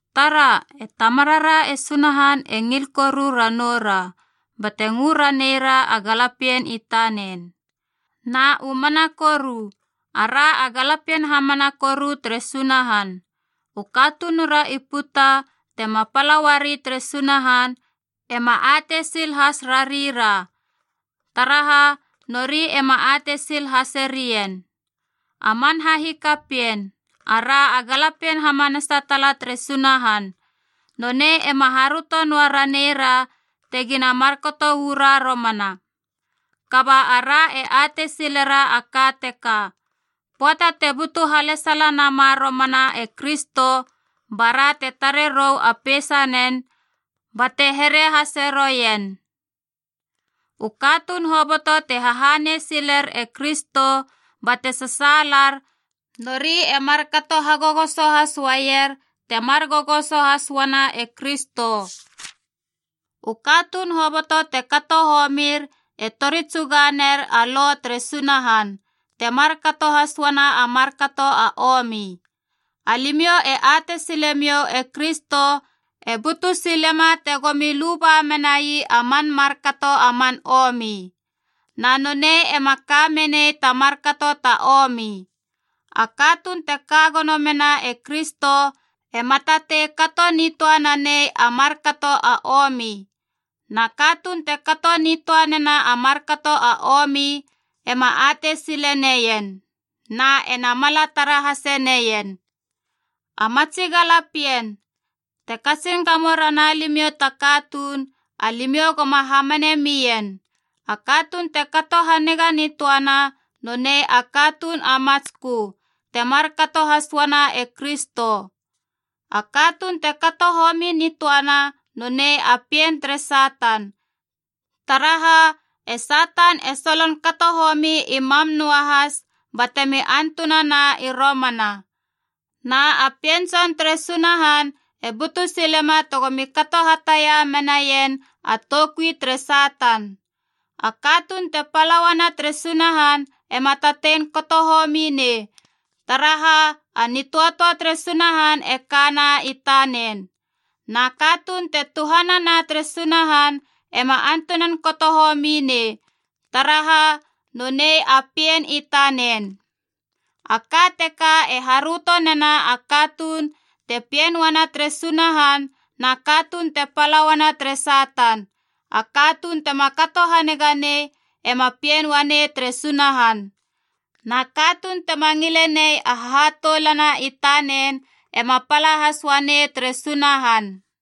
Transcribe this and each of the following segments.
Tara, e Tamarara e Sunahan e ngil koru ranoura, bate ngö raneira a galapien i tanen. Na u mana koru, ara a galapien hamana koru tere Sunahan. U katunura i puta tema pala uari tere Sunahan ema atei sil has rarira, taraha nori ema atei sil haserien. A man hahikapien, ara a galapien hamanasa tala tere Sunahan. Nonei ema haröto noa raneira tegina markato uu ra romana. Kaba ara e atei silera a ka teka: pöata te butu halesala nama romana e Kristo bara te tare rou a peisanen bate here hase roien. U katuun hoboto te hahanei siler e Kristo bate sasaalar, nori e markato hagogoso has uaier temar gogoso has uana e Kristo. U katuun hoboto te kato homir e tori tsuga ner a Lo tere Sunahan, te markato has uana a markato a omi. Alimiou e atei silemiou e Kristo e butu silema tegomi luba menai a man markato a man omi. Na nonei ema ka menei ta markato ta omi. A katuun te ka gono mena e Kristo ema tatei kato nitöa nanei a markato a omi. Na katuun te kato nitöa nena a markato a omi ema atei sile neien, na ena mala tara hase neien. A matsi galapien, te katsin gamo rana limiou ta katuun, alimiou goma hamane mien. A katuun te kato haniga nitöana, nonei a katuun a matskö, te markato has uana e Kristo. A katuun te kato homi nitöana nonei a pien tere Satan, taraha e Satan e solon kato homi i mam noahas batemi antunana i romana. Na a Pien Tson tere Sunahan e butu silema tegomi kato hatia menaien a toukui tere Satan. A katuun te pala uana tere Sunahan ema tatei kato homi nei, taraha a nitöatöa tere Sunahan e kana i tanen. Na katuun te tuhanama tere Sunahan ema antunan kato homi nei, taraha nonei a pien i tanen. A ka teka e haröto nena a katuun te pien uana tere Sunahan na katuun te pala uana tere Satan: a katuun tema kato haniga nei ema pien uanei tere Sunahan. Na katuun tema ngile nei a hahatoulana i tanen ema pala has uanei tere Sunahan.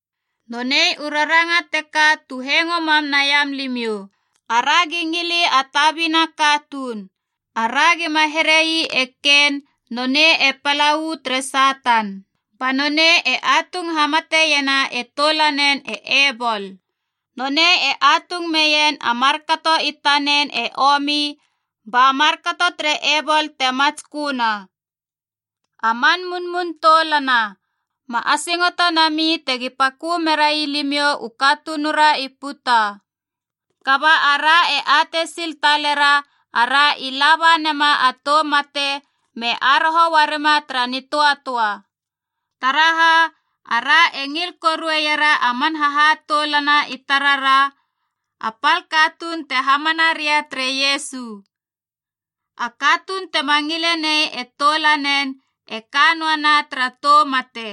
Nonei u raranga teka tu hengo mam naiam limiou: aragi ngili a tabina katuun. Ara gima here ii e Kein nonei e pala uu tere Satan, ba nonei e atung hamateiena e toulanen e Ebol. Nonei e atung meien a markato i tanen e omi ba markato tere Ebol te matsköna. A man munmun toulana, ma asingoto nami tegi pakö merai limiou u katunura i puta. Kaba ara e atei sil talera ara i laba nema a tou mate me aroho uarima tara nitöatöa. Taraha ara e ngil korueiera a man hahatoulana i tarara, a pal katuun te hamana ria tere Iesu. A katuun tema ngile nei e toulanen e ka noana tara tou mate.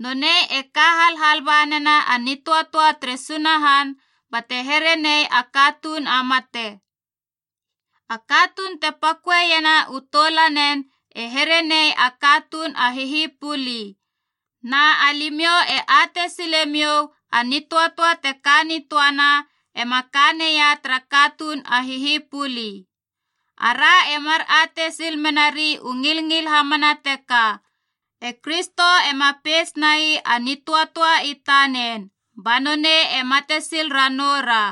Nonei e ka halhal ba nena a nitöatöa tere Sunahan bate here nei a katuun a mate. A katuun te paköeiena u toulanen e here nei a katuun a hihipuli. Na alimiou e atei silemiou a nitöatöa te ka nitöana ema ka neia tara katuun a hihipuli. Ara e mar atei sil mena rei u ngilngil hamana teka: e Kristo ema peitsnai a nitöatöa i tanen, ba nonei e mate sil ranoura.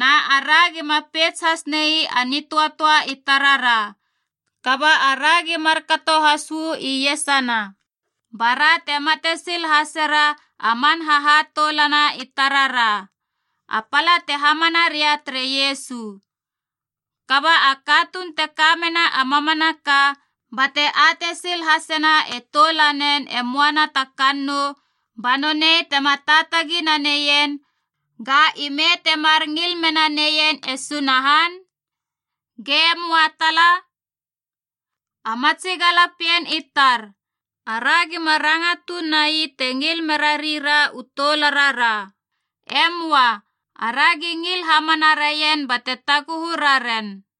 Na ara gima peits has nai a nitöatöa i tarara, kaba aragi markato has uu iesana bara te mate sil hasera a man hahatoulana i tarara, a pala te hamana ria tere Iesu. Kaba a katuun te ka mena a mamanaka bate atei sil hasena e toulanen e moana ta kannou ba nonei tema taatagi naneien, ga ime temar ngil mena neien e Sunahan? Ge möa tala. A matsi galapien i tar, ara gima ranga tuun nai te ngil merarira u toularara. E möa. Aragi ngil hamana raien bate taguhu raren.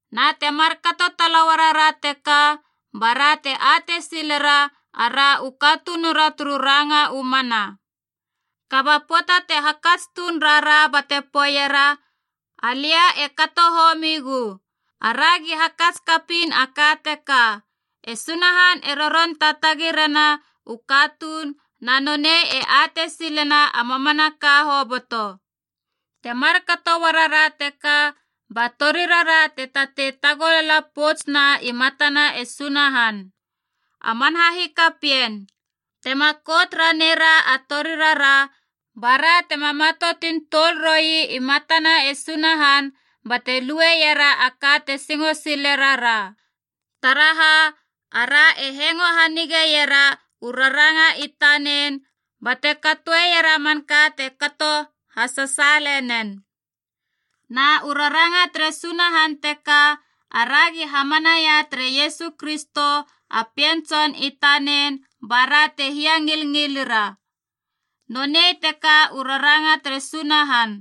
Na te markato tala uarara teka, bara te atei silera ara u katunura turu ranga u mana. Kaba pöata te hakats tuun rara bate poeiera, “Alia e kato homigu,” aragi hakats kapiin a ka teka: e Sunahan e roron taatagi rena u katuun na nonei e atei silena a mamanaka hoboto. Te markato uarara teka ba torirara te tatei tagolala poutsuna i matana e Sunahan. A man hahikapien, tema kout raneira a torirara, ba ra tema matoutun tuol roi i matana e Sunahan bate luera a ka te singo sile rara. Taraha, ara e hengo hanigeiera u raranga i tanen bate katoera a manka te kato hasasaale nen. Na u raranga tere Sunahan teka: aragi hamanaia tere Iesu Kristo a Pien Tson i tanen ba ra te hiangilngilira, nonei teka u raranga tere Sunahan.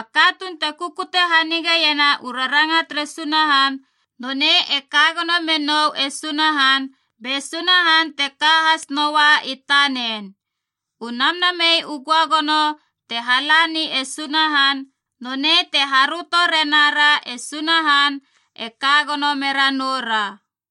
A katuun te kukute hanigeiena u raranga tere Sunahan, nonei e ka gono menou e Sunahan, be Sunahan te ka has noa i tanen. U Namnamei u Göagono te halani e Sunahan, nonei te haröto renara e Sunahan e ka gono mera noura.